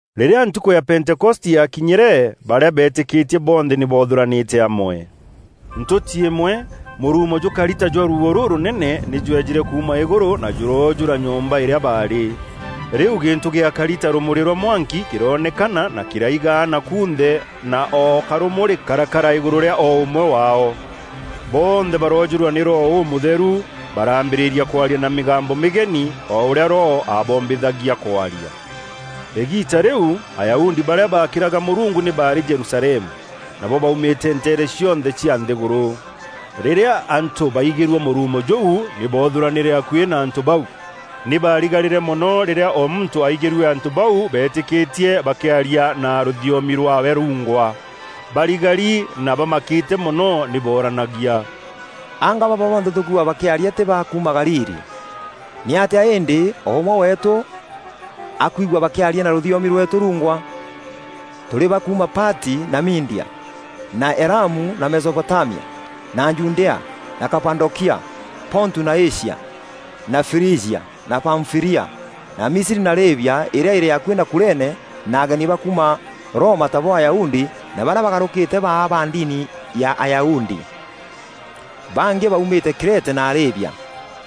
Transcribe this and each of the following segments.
Rîrîa ntukû ya Pentekoste yakinyîre, barîa beetîkîtie bonthe nî boothûranîte amwe. Ntûti îmwe mûruumo jûkari ta jwa ruuo rûrûnene nî jwejîre kuuma îgûrû na jûroojûra nyomba îrîa baarî. Rîu gîntû gîakari ta rûmûrî rwa mwanki kîroonekana na kîraigaana kunthe na o karûmûrî karakara îgûrû rîa o ûmwe waao. Bonthe baroojûrwa nî Roho Ûmûtheru, baraambîrîria kwaria na mîgambo mîgeni o ûrîa Roho aabombithagia kwaria. Îgiita rîu Ayahudi barîa baakîraga Mûrungu nî baarî Jerusalemu. Nabo baumîte nteere cionthe cia nthîgûrû. Rîrîa antû baigîrue mûruumo jûu, nî boothûranîre akuî na antû bau. Nî baarigarîre mono rîrîa o muntû aigîrue antû bau beetîkîtie bakîaria na rûthiomi rwaawe rungwa. Barigari na bamakîte mono nî booranagia, “Anga baba bonthe tûkwigua bakîaria tî ba kuuma Galili? Nîatîa îndî, o ûmwe weetû akwigua bakîaria na rûthiomi rweetû rungwa? Tûrî ba kuuma Pati, na Media, na Elamu na Mesopotamia, na Judea, na Kapadokia, Pontu na Asia, na Frijia na Pamfîlia, na Misri na Lîbia îrîa îrî akuî na Kurene na ageni ba kuuma Roma tabo Ayahudi na barîa baagarûkîte baa ba ndini ya Ayahudi. Bangî baumîte Krete na Arabia.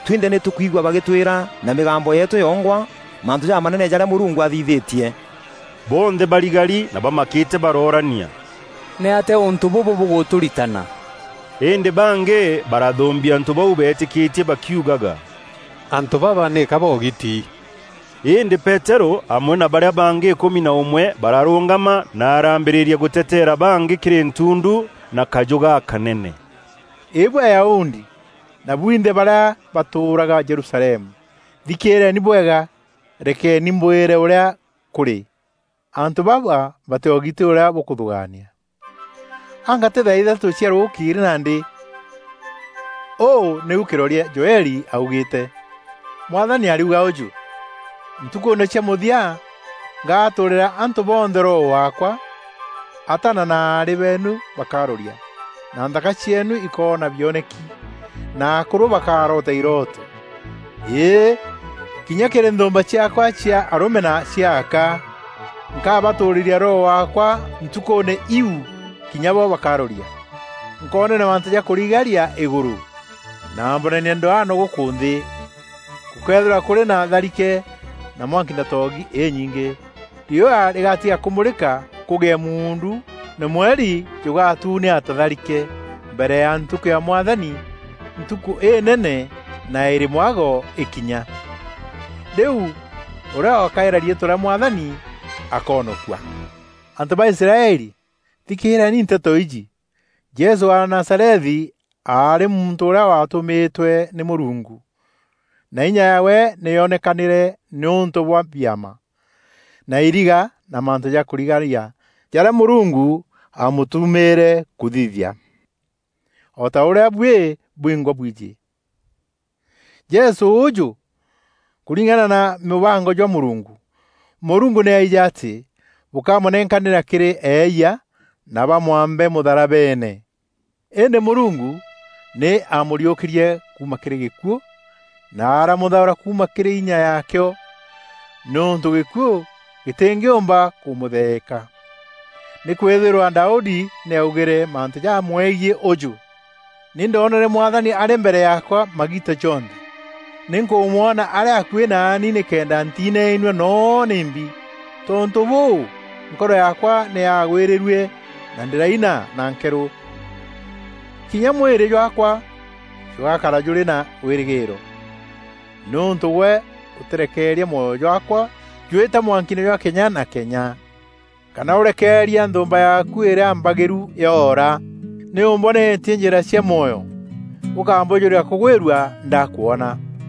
Twinthe nî tûkwigua bagîtwîra na mîgambo yeetû yongwa mantû jamanene jarîa Mûrungu athithîtie.” Bonthe barigari na bamakîte barooranîa, “Nîatîa ûntû bûbû bûgûtûritana?” Îndî bangî barathûmbia antû bau beetîkîtie bakiugaga, “Antû baba nîka boogiti.” Îndî Peterû amwe na barîa bangî îkûmi na ûmwe bararûngama, na araambîrîria gûteteera bangî kîrî ntundu na kajû gakanene, “Îbuî Ayahudi na bwinthe barîa batûûraga Jerusalemu, thikîîreeni bwega, rekeni mbwîre ûrîa kûrî. Antû baba batîogiti ûrîa bûkûthûgaania. Anga tî thaa ithatû cia rûkîîrî nandî? Ûû nîu kîroria Joeli aaugîîte: ‘Mwathani ariuga ûjû; ntukûûne cia mûthia, ngatûûrîra antû bonthe Roho waakwa, ataana na aarî beenu bakaroria, na nthaka cieenu îkoona bioneki, na akûrû bakaroota irooto. Îî, kinya kîrî nthûûmba ciaakwa cia arûme na cia aka, nkabatûûrîra Roho waakwa ntukûûne iu, kinya bo bakaroria. Nkoonania mantû ja kûrigaria îgûrû, na mbonanie ndwano gûkû nthî; gûkeethîrwa kûrî na tharike, na mwanki na toogi înyingî; riûa rîgatiga kûmûrîka kûgîe muundu, na mweri jûgatûnea ta tharike, mbere ya ntukû ya Mwathani, ntukû înene na îrî mwago îkinya. Rîu, ûrîa ûgakaîra riîtwa rîa Mwathani akoonokua.’ “Antû ba Israeli, thikîîreeni nteto iji: Jesû wa Nazarethi aarî muntû ûrîa waatûmîtwe nî Mûrungu, na inya yaawe nî yoonekanîre nîûntû bwa biama, na iriga, na mantû ja kûrigaria jarîa Mûrungu aamûtumîre kûthithia, o ta ûrîa buî bwingwa bwijî. Jesû ûûjû, kûringana na mûbango jwa Mûrungu, Mûrungu nî aijî atî bûkamûnenkanîra kîrî eeyia na bamwambe mûtharabeene. Îndî Mûrungu nî aamûriûkîrie kuuma kîrî gîkuû, na aramûthaûra kuuma kîrî înya yaakîo, nîûntû gîkuû gîtîngîûmba kûmûtheeka. Nîkwîthîrwa Daudi nî aaugîre mantû jamwegiî ûjû: ‘Nî ndoonere Mwathani arî mbere yaakwa magiita jonthe; nî nkûmwona arî akuî naani nîkenda ntinainua noo nîmbi. Tontû bûû, nkoro yaakwa nî yaagwîrîrue; na ndîraina na nkeerû. Kinya mwîrî jwaakwa jûgakara jûrî na wîrîgîîro; nîûntû gwe ûtîreekeria mwoyo jwaakwa jwîta mwankiine jwa kenya na kenya, kana ûrekeeria nthûûmba yaaku îrîa mbagîru yoora. Nî ûmbonetie njîra cia mwoyo, ûkambûjûria kûgwîrua ndakwona.’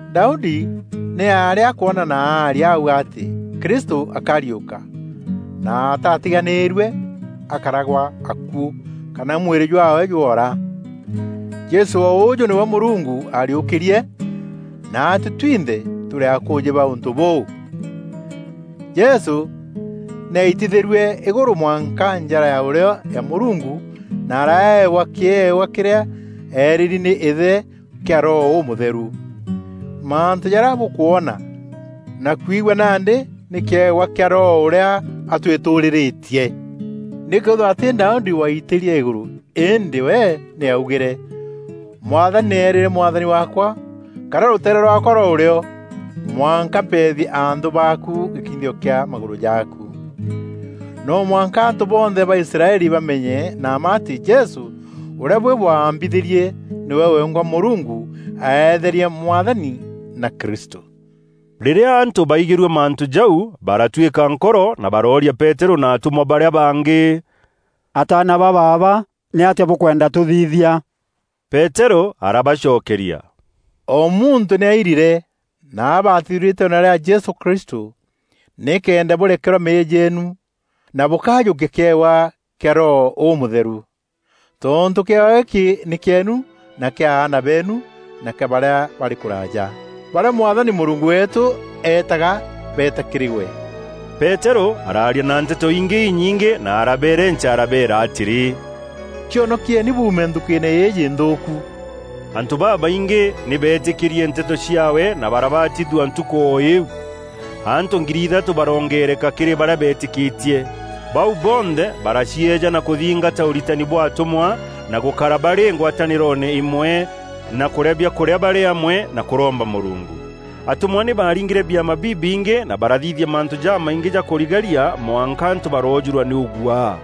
Daudi nî aarî akwona na aaria auga atî Krîstû akarîûka na ‘ataatiganîîrue akara gwa akuû kana mwîrî jwaawe jwoora.’ Jesû o ûûjû nîwe Mûrungu aariûkîrie, naatuî twinthe tûrî akûûjî ba ûntû bûu. Jesû nî aitithîrue îgûrû mwanka njara ya ûrîo ya Mûrungu na araewa kîewa kîrîa eerîîri nî Îthe kîa Roho Ûmûtheru. Mantû jarîa bûkwona na kwigua nandî nî kîewa kîa Roho ûrîa atûîtûûrîrîtie. Nîkwîthîrwa tî Daudi waaitîrie îgûrû îndî we nî aaugîre: ‘Mwathani nî eerîre Mwathani waakwa; kara rûteere rwaakwa rwa ûrîo, mwanka mpeethie anthû baaku, gîkinyithio kîa magûrû jaaku.’ “No mwanka antû bonthe ba Israeli bamenye na mma atî Jesû ûrîa buî bwaambithîrie, nîwe wengwa Mûrungu aeetherie Mwathani na Kristû.” Rîrîa antû baigîrue mantû jau, baratwîka nkoro, na barooria Peterû na atûmwa barîa bangî: “Ataana ba baaba, nîatîa bûkwenda tûthithia?” Peterû arabacokeria, “O muntû nî airire na abatithue riîtweene rîa Jesû Kristû nîkenda bûrekerwa meeyia jeenu na bûkajûkia kîewa kîa Roho Ûmûtheru. Tontû kîewa gîkî nî kîeenu na kîa aana beenu na kîa barîa barî kûraja, barîa Mwathani Mûrungu weetû eetaga beeta kîrî we.” Peterû araaria na nteto ingî inyingî na arabeerenca arabeera atîrî, “Cionokieni buume nthukîîne îîjî nthûûku.” Antû babaingî nî beetîkîrie nteto ciaawe na barabatithua ntukû o îîu. Antû ngiri ithatû baroongeereka kîrî barîa beetîkîtie. Bau bonthe baracieejana kûthingata ûritani bwa atûmwa, na gûkara barî ngwatanîroone îmwe na kûrîa biakûrîa barî amwe na kûromba Mûrungu. Atûmwa nî baaringîre biama bibingî na barathithia mantû jamaingî ja kûrigaria mwanka antû baroojûrwa nî ûguaa.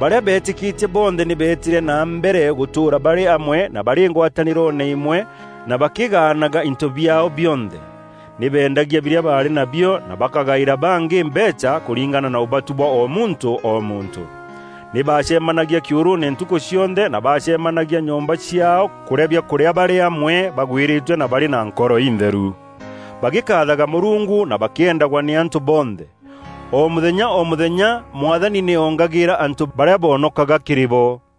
Barîa beetîkîtie bonthe nî beetîre na mbere gûtûûra barî amwe na barî ngwatanîroone îmwe na bakîgaanaga into biaao bionthe. Nî beendagia birîa baarî na bio na bakagaîra bangî mbeecha kûringana na ûbatu bwa o muntû o muntû. Nî baacemanagia kîûrûûne ntukû cionthe na baacemanagia nyomba ciaao kûrîa biakûrîa barî amwe bagwîrîtue na barî na nkoro intheru, bagîkaathaga Mûrungu, na bakîendagwa nî antû bonthe. O mûthenya o mûthenya Mwathani nî oongagîîra antû barîa boonokaga kîrî bo.